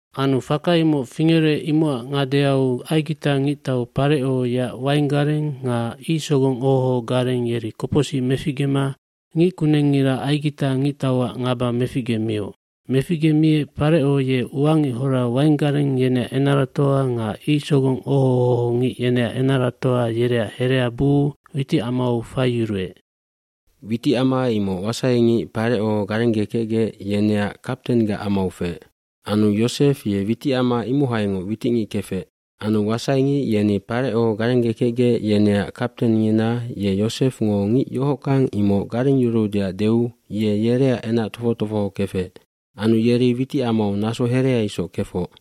Anu faka imoc fingerec imocac ngadeau Aigita ngictau Pareco yeac wainggareng nga icsogong oho ohogareng yeri kopocsic meficgema ngickunengngira Aigita ngictauac ngaba meficgemioc. Meficgemiec Pareco ye uangichora wainggareng yeneac enaratoa nga icsogong oho ohongic yeneac enaratoa yereac herea buu awiticamau faiyuruec. Witicama imoc wasaingic Pareco garenggekecgec yeneac kaptenggac amau feec. Anu Yosef ye witicama imohaingoc witicngic kefec. Anu wasaingic yeni Pareco garenggekecgec yeneac kaptengngina ye Yosefngo ngic yohockang imoc garengyuruudeac deu ye yereac enac tofoc tofoho kefec. Anu yeri witicamau naso herea isoc kefoc.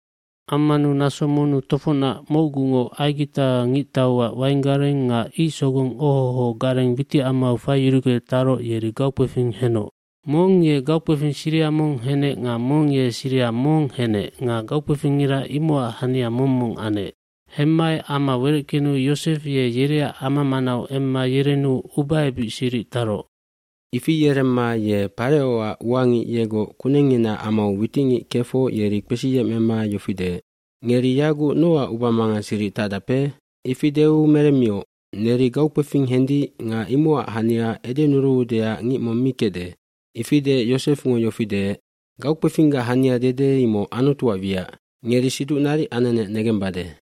Ammanu naso monnu tofocnac mocgungoc Aigita ngictauac wainggareng nga icsogong oho oho gareng witicamau faiyurugec taroc yeri gaukpefing henoc. Mong ye gaukpefing siriha mong henec nga mong ye siriha mong henec nga gaukpefingngira imocac hania mong mong anec. Hemmaec ama wereckenu Yosef ye yereac ama manau emma yerenu ubaebic siric taroc. Ifi yeremma ye Parecoac uangic yegoc kunengnginaac amau witicngic kefoc yeri kpesiyemecma yofi deec, “Ngeri yaguc nocac ubamangang siric tacdape?” bIfi deu meremmioc, “Neri gaukpefing hendic nga imocac hania edenuruudeac ngic mong mi kecde.” Ifi deec Yosefngo yofi deec, “Gaukpefinggac hania dede imoc Anutuac wiac. Ngeri siduc naric anenec negembade.”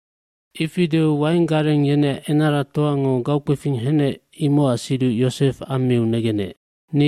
Ifi deu wainggareng yeneac enaratoango gaukpefing henec imocac siduc Yosef ammiu negenec,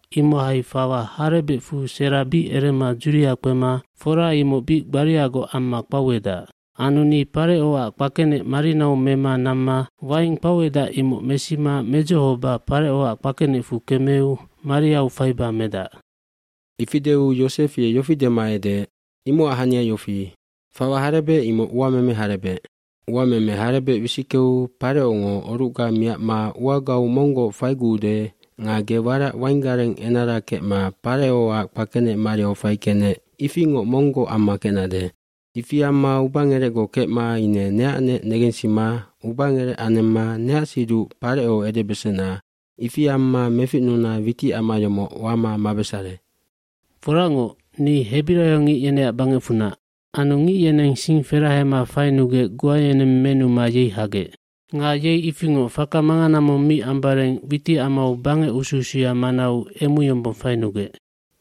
imohai fawa harebecfu sera bic erema dzuria kpema fora imoc bic gbariagoc amma kpauedac. Anu ni Parecoac kpakenec marinau mema namma waing kpauedac imoc mesima medzohoba Parecoac kpakenecfu kemeu mariau faiba medac.” Ifi deu Yosef ye yofi dema edeec, “Imocac hania yofi, fawa harebec imoc uameme harebec. Uameme harebec wisickeu Parecongo orucga miacma uagau monggoc faiguude nga ge warac wainggareng enara kecma Parecoac kpakenec mariau faikecnec ifingoc monggoc amma kecnade. Ifi amma ubangerecgoc kecma ine neacnec negensima ubangerec anemma neac siduc Pareco edebesena ifi amma meficnuna witicama yomoc wama mabesare. cForacngoc, ni hebiraiongic yeneac bangecfunac. Anu ngic yeneng sing ferahema fainugec goa yeneng menuma yei hagec. Nga yei ifingoc faka mangana mong mi ambareng witicamau bangec usu usuya manau emu yombong fainugec.”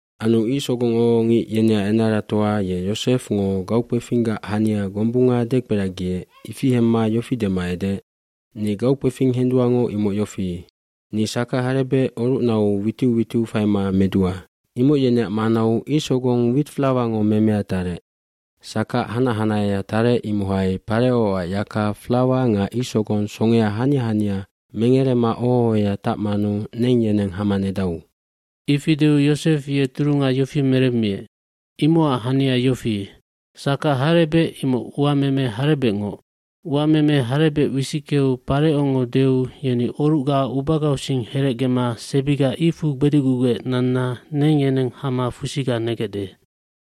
Anu icsogong oho ohongic yeneac enaratoa ye Yosefngo gaukpefinggac hania gombunga dekperagiec ifi hemma yofi dema edeec, “Ni gaukpefing henduangoc imoc yofi, ni sakac harebec orucnau witiu witiu faima medua. Imoc yeneac manau icsogong witflawango memea tarec. Sakac hanac hanahea tarec imohai Parecoac yaka flawa nga icsogong songea hania hania mengerema oho ohoya tacmanu neng yeneng hama nedau.” Ifi deu Yosef ye turunga yofi meremmiec, “Imocac hania yofi, sakac harebec imoc uameme harebecngoc. Uameme harebec wisickeu Parecongo deu yeni orucga ubagausing herecgema sebiga icfu gbedicgugec nanna neng yeneng hama fusiga negecde.”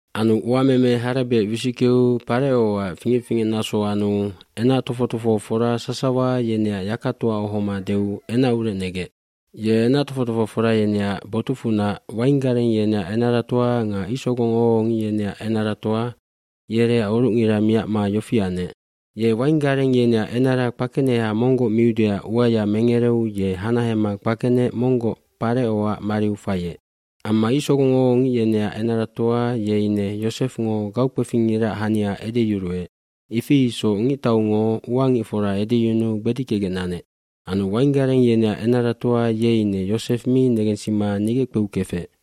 Anu uameme harebec wisickeu Parecoac fingec fingecnaso anu enac tofoc tofohofora sasawa yeneac yakatoa ohoma deu enacurec negec. Ye enac tofoc tofohofora yeneac botucfunac wainggareng yeneac enaratoa nga icsogong oho ohongic yeneac enaratoa yereac orucngira miacma yofi anec. Ye wainggareng yeneac enara kpakeneha monggoc miudeac uaya mengereu ye hanahema kpakenec monggoc Parecoac mariu faiec. Amma icsogong oho ohongic yeneac enaratoa ye ine Yosefngo gaukpefingngiraac hania edeyuruec, ifi isoc ngictaungo uangicfora edyunuu gbedickegec nanec. Anu wainggareng yeneac enaratoa ye ine Yosef mi negensima nigeckpeu kefec.